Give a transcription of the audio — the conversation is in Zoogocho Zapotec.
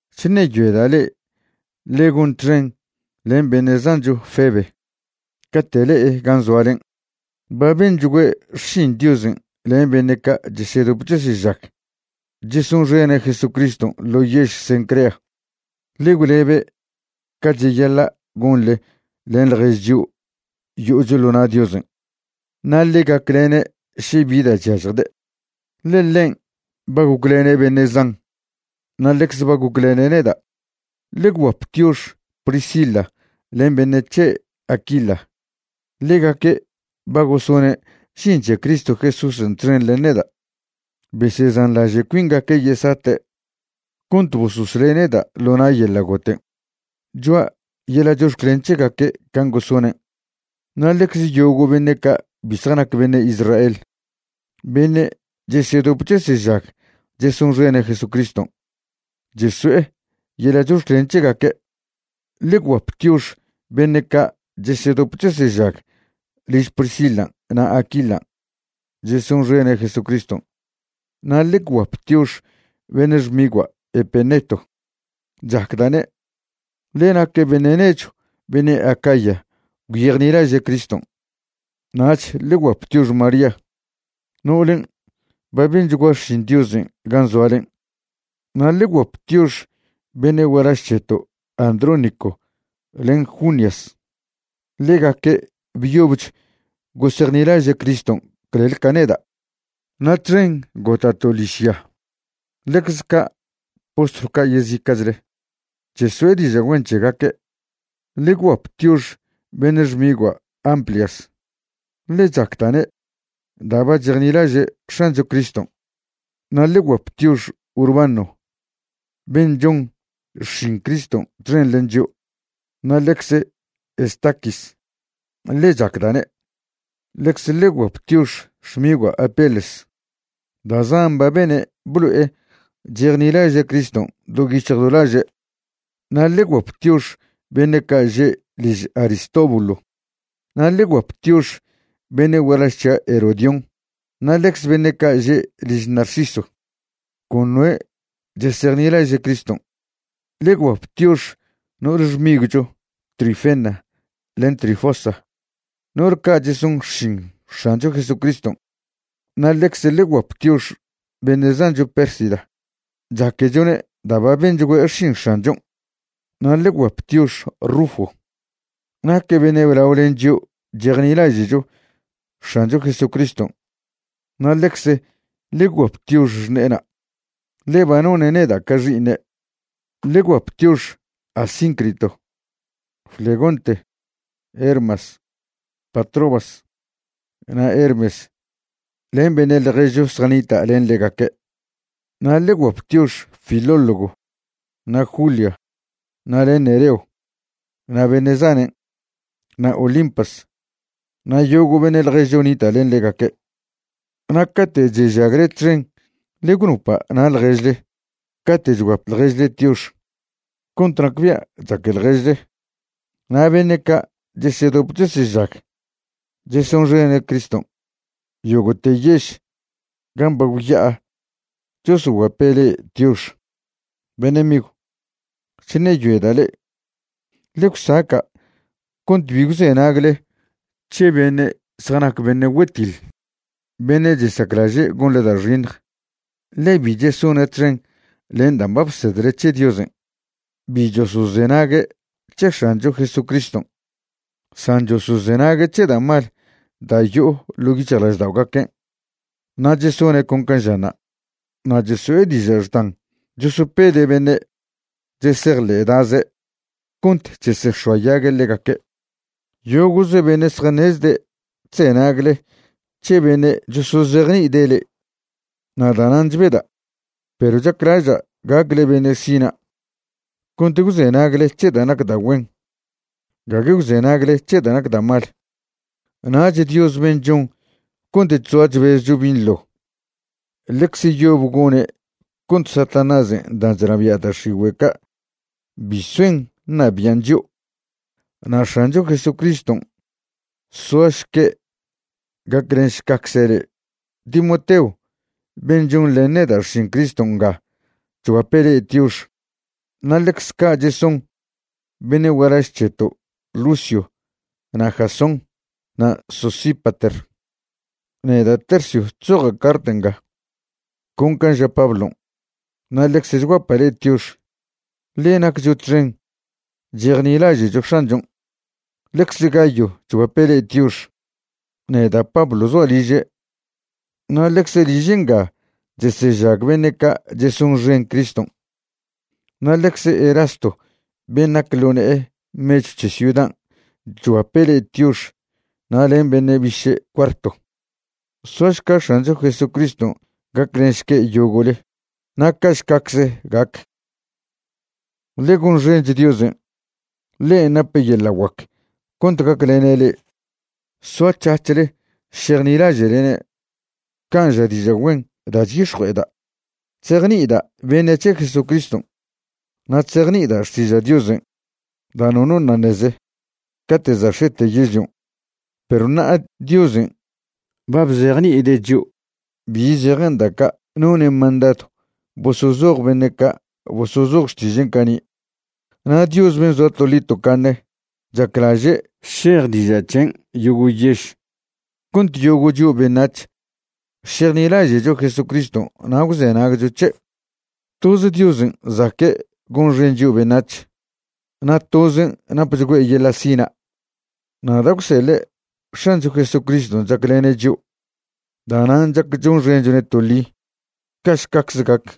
Chṉeyoeda' le'e ḻe gon txen len beṉe' zancho Febe cate' le'e gan' zoalen'. Ba benchgüe' xšin Diosen' len beṉe' ca' chesedop chesežag chesonxene' Jesucriston' ḻo yež Cencrea. Ḻe gwlebe' ca cheyaḻa' gonḻe len ḻjež chio' yo'ocho ḻo na' Diosen'. Na' ḻe gaclene' še bi da' chyažjde', ḻe ḻen' ba goclene' beṉe' zan na' ḻecze ba goclene' neda'. Ḻe gwguap tiox Priscila len beṉe' c̱he' Aquila. Ḻegaque' ba gosone' žin c̱he Cristo Jesúsen' txen len neda'. Besezanḻaže' cuingaque' yesate' cont bososle' neda' ḻo na' yeḻa' goten'. Choa' yeḻa' chox̱clen c̱hegaque' can' gosonen'. Na' ḻecze yogo' beṉe' ca' bi zjanac beṉe' Israel beṉe' chesedop chesežag chesonxene' Jesucriston' cheso'e yeḻa' chox̱clen c̱hegaque'. Ḻe gwguap tiox beṉe' ca' chesedop chesežag liž Priscilan' na' Aquilan' chesonxene' Jesucriston'. Na' ḻe gwguap tiox beṉe' xmigua' Epeneto. Chacda'ne', ḻe naque' beṉe' nechw beṉe' Acaya gwyejnilaže' Criston'. Nach ḻe gwguap tiox María no'olen' ba benchgua xšin Diosen' gan' zoalen'. Na' ḻe gwguap tiox beṉe' gualaž c̱heto' Andrónico len Junias. Ḻegaque' byobch gosejnilaže' Criston' clel ca neda' na' txen gota'to' ḻižya. Ḻecz ca' postlw ca' yezica'chle cheso'e diža' güen c̱hegaque'. Ḻe gwguap tiox beṉe' xmigua' Amplias, ḻe chacda'ne' da' ba chejnilaže' X̱ancho Criston'. Na' ḻe gwguap tiox Urbano ben' chon xšin Criston' txen len chio', na' ḻecze Estaquis, ḻe chacda'ne'. Ḻecze ḻe gwguap tiox xmigua' Apeles. Da' zan ba bene' blo'e chejnilaže' Criston' do yic̱hj do laže'. Na' ḻe gwguap tiox beṉe' ca' že' liž Aristóbulo. Na' ḻe gwguap tiox beṉe' gualaž c̱hia' Herodión na' ḻecze beṉe' ca' že' liž Narciso, con noe' chesejnilaže' Criston'. Ḻe gwguap tiox no'ole xmigwcho Trifena len Trifosa, no'ol ca' cheson xšin X̱ancho Jesucriston'. Na' ḻecze ḻe gwguap tiox beṉe' zancho Pérsida. Chaquechone' da' ba benchgüe' xšin X̱anchon'. Na' ḻe gwguap tiox Rufo. Naque' beṉe' blao len chio' chejnilaže'cho X̱ancho Jesucriston'. Na' ḻecze ḻe gwguap tiox xṉe'ena', ḻe ba none' neda' ca xi'iṉe'. Ḻe gwguap tiox Asíncrito, Flegonte, Hermas, Patrobas na' Hermes len beṉe' ḻježcho zjanita' len ḻegaque'. Na' ḻe gwguap tiox Filólogo na' Julia na' len Nereo na' beṉe' zanen', na' Olimpas na' yogo' beṉe' ḻježcho nita' len ḻegaque'. Na' cate' chežagle txen ḻe gwnopa' na' ḻježle cate' chguap ḻježle tiox cont nacbia' chaque ḻježle. Na' beṉe' ca' chesedop chesežag chesonxene' Criston' yogo'te yež gan' ba gwya'a chosoguape' le'e tiox. Beṉe' migw, chṉeyoeda' le'e ḻe gwsaca' cont bi gwzenagle c̱he beṉe' zjanac beṉe' güetiḻ, beṉe' chesaclaže' gonḻe da' xiṉj, ḻe bi chesone' txen len dan' ba bsedle c̱he Diosen'. Bi chosozenague' c̱he X̱ancho Jesucriston' san chosozenague' c̱he da' mal da' yo'o ḻo yic̱hjlažda'ogaquen' na' chesone' con can' žanṉa'. Na' cheso'e diža' xdan chosopede' beṉe' chesejḻe'daze cont chesex̱oayague' ḻegaque'. Yogo'ze beṉe' zjaṉezde' chzenagle c̱he beṉe' chosozejni'ide' le'e, na' danan' chbeda'. Perw chaclaža' gacle beṉe' sina' cont gwzenagle c̱he da' nac da' güen, gague gwzenagle c̱he da' nac da' mal. Nach Dios ben' chon cont chzoa chbezcho binḻo ḻecze yob gone' cont Satanásen' dan' chnabia' da' x̱igüe' ca' bi soen ṉabi'an chio'. Na' X̱ancho Jesucriston' soašque' gaclenšcacze' le'e. Timoteo ben' chonḻen neda' xšin Criston' nga chguape' le'e tiox, na' ḻecze ca' cheson beṉe' gualaž c̱heto' Lucio na' Jasón na' Sosípater. Neda' Tercio chzoja' cart nga con can' ža Pablon', na' ḻecze chguapa' le'e tiox, ḻe naccho txen chejnilaže'cho X̱anchon'. Ḻecze Gayo chguape' le'e tiox. Neda' Pablo zoa' liže' na' ḻecze liže' nga chesežag beṉe' ca' chesonxen Criston'. Na' ḻecze Erasto ben' nac ḻo ne'e mechw c̱he ciudan' chguape' le'e tiox na' len beṉe' biše' Cuarto. Soašca X̱ancho Jesucriston' gaclenšque' yogo'le. Na' ca'šcacze gac. Ḻe gonxench Diosen'. Ḻen' nape' yeḻa' guac cont gaclene' le'e soac̱hac̱hle šejnilaže'lene' can' ža diža' güen da' chyix̱jue'eda' chzejni'ida' beṉe' c̱he Jesucriston'. Na' chzejni'ida' xtiža' Diosen' da' nono ṉa' ṉeze cate' za' x̱ete yežlion', perw ṉa'a Diosen' ba bzejni'ide' chio' bi zejen da' ca' none' mandadw bosozoj beṉe' ca' bosozoj Xtižen' cani'. Na' Dios ben' zoa toḻi tocaṉe chaclaže' šej diža' c̱hen' yogo' yež cont yogo' chio' beṉac̱h šejnilaže'cho Jesucriston' na' gwzenagcho c̱he'. Toze Diosen' zaque' gonxen chio' beṉac̱h, na' tozen' napchgüe' yeḻa' sina'. Na' da' gwseḻe' X̱ancho Jesucriston' chaclene' chio', da'nan' chac chonxenchone' toḻi. Ca'šcacze gac.